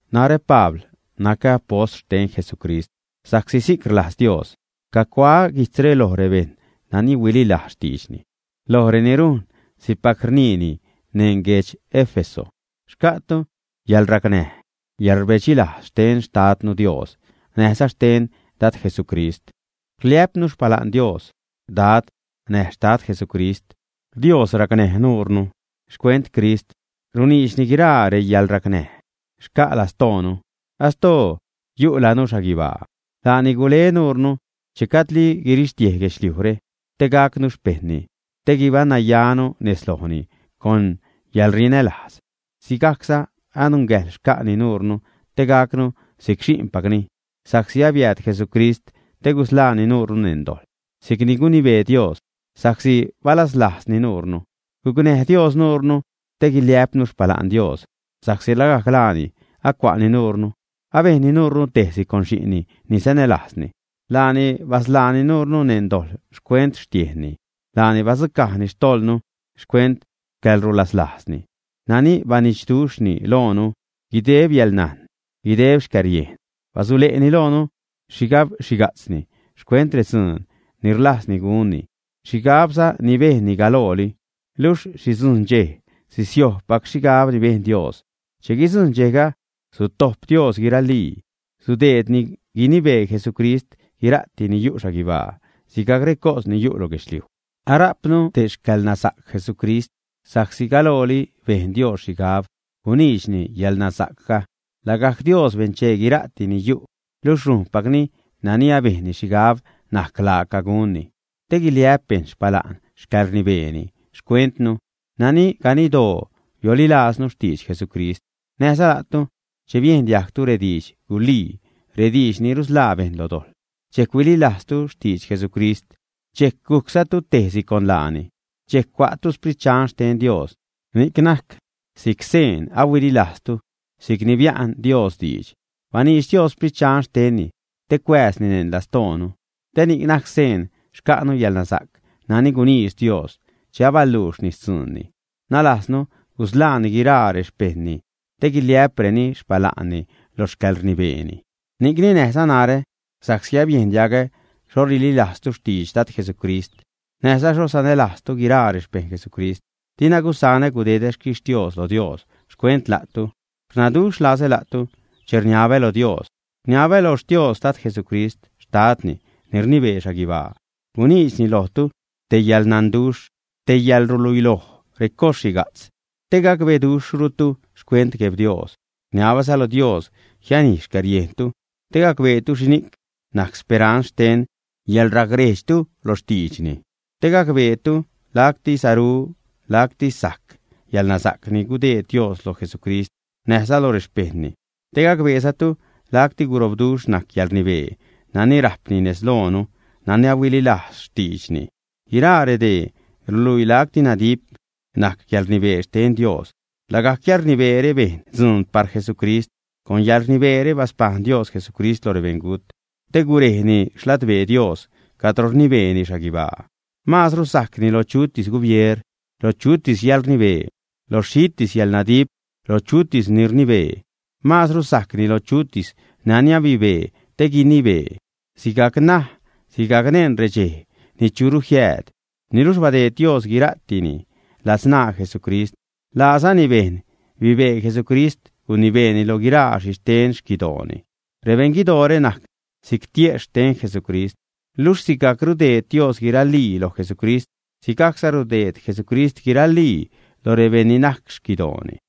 Narä, Pabl, nacä apost xten Jesucrist sa'csi si'c rlajz Dios. Cacuaä guijtzre loj rebejṉ nani huililajz xtiidxni, loj reni rujn si'cpac rniini neṉ guedx Éfeso. Xca'tu yäḻracnäj, yäḻrbedxi lajz xten Xtadnu Dios, näjza xten Dad Jesucrist. Rliä'pnu xpala'n Dios, Dad näj Xtad Jesucrist. Dios racnäj nuure, xcuent Crist runiidxni guiraa reyäḻracnäj xca' lastoonu, astoo yu'lanu xhaguibaa. Laani gule nuure, che gajdli guirixtiej guedxliujre, te gacnu xpejṉni, te guibaṉnayanu nez lojni con yäḻrinälajz. Sigajcza anungäjḻ xca'ni nuure te gacnu si'c xi'npacni sa'csi abiääd Jesucrist te gusḻaani nuure neṉ dojḻ, si'c ni gunibee Dios sa'csi balaslajzni nuure. Gucnäj Dios nuure te guiliä'pnu xpala'n Dios, sa'csi lagajc laani acua'ni nuure, abejnni nuure tejsi con xi'nni ni sanälajzni. Laani basḻaani nuure neṉ dojḻ xcuent xtiejnni, laani badzucajni xtojḻnu xcuent xcäḻruslaslajzni nani banidxduxhni loonu. Guideb yäḻnajn, guideb xcäriejn basule'ni loonu xhigab xhiga'tzni xcuent redzuun ni rlajzni gunni, xhigabza ni bejnni galooli. Luxh sidzujṉ dxej sisiojbpac xhigab ni bejn Dios. Che guidzujṉ dxejga sutojp Dios guiraali, sudeedni guinibee Jesucrist guira'ti ni yu' xhaguibaa, sigajc recos ni yu' lo guedxliuj. Arajpnu te xcäḻnasa'c Jesucrist, sa'csi galooli bejn Dios xhigab guniidxni yäḻnasa'cga. Lagajc Dios benchee guira'ti ni yu', luxh rujnpacni nani abejnni xhigab najc laaca gunni te guiliä'p bejṉ xpala'n xcäḻrnibeeni xcuentnu, nani ganiddoo biolilaaznu xtidx Jesucrist. Näjza la'tu, che biejn diajgtu redidx gulii, rediidx ni rusḻaa bejṉ lo dojḻ, dxejc huililajztu xtidx Jesucrist, dxejc gujczatu tejsi con laani. Dxejc cua'tu Sprit Dxan xten Dios, ni'c najc si'c seen ahuililajztu, si'cni bia'n Dios diidx. Baniidx Dios Sprit Dxan xtenni te cuääzni neṉ lastoonu, te ni'c najc seen xca'nu yäḻnasa'c nani guniidx Dios che abaluuxni xtzuunni, nalajznu gusḻaani guiraa rexpejṉni te guiliä'preni xpala'nni lo xcäḻrnibeeni. Ni'cni näjza narä, sa'csi abiejn diagä xho rililajztu xtidx Dad Jesucrist näjza xho sanälajztu guiraa rexpejṉ Jesucrist, dina gusaṉä gudedä xquixtios lo Dios xcuent la'tu. Rnaduxh lazä la'tu che rniabä lo Dios. Rniabä lo Xtios Dad Jesucrist, xtadni ni rnibee xhaguibaa, guniidxni lojtu te yäḻnanduxh, te yäḻruluiloj recos xhiga'tz te gacbeduxhrutu xcuent Gueb Dios. Rniabäza lo Dios jianij xcäriejntu te gacbeetu xhini'c najc speranz xten yäḻracrejdxtu lo xtiidxni, te gacbeetu lacti saru, lacti sajc yäḻnasa'c ni gudeed Dios lo Jesucrist näjza loj rexpejṉni, te gacbeezatu lacti gurobduxh najc yäḻrnibee nani rajpni nez loonu nani ahuililajz xtiidxni. Guiraa redee ruluii lacti nadip najc yäḻrnibee xten Dios. Lagajc yäḻrnibeere bejn dzuun par Jesucrist. Con yäḻrnibeere baspajṉ Dios Jesucrist lo rebeṉgut, te gurejni xladbee Dios cadro rnibeeni xhaguibaa. Maazru sajcni lo chutis gubier, lo chutis yäḻrnibee, lo xhitis yäḻnadip, lo chutis ni rnibee; maazru sajcni lo chutis nani abibee te guinibee, sigajc ṉaj, sigajc neṉ redxej ni churu jiääd. Niluxh badeed Dios guira'tini ladzṉaa Jesucrist, laazani bejn bibee Jesucrist gunibeeni lo guiraa xhixten xquidooni. Rebeṉ guidoore najc si'c tiejxh xten Jesucrist, luxh sigajc rudeed Dios guiralii loj Jesucrist, sigajcza rudeed Jesucrist guiralii loj rebejṉ ni najc xquidooni.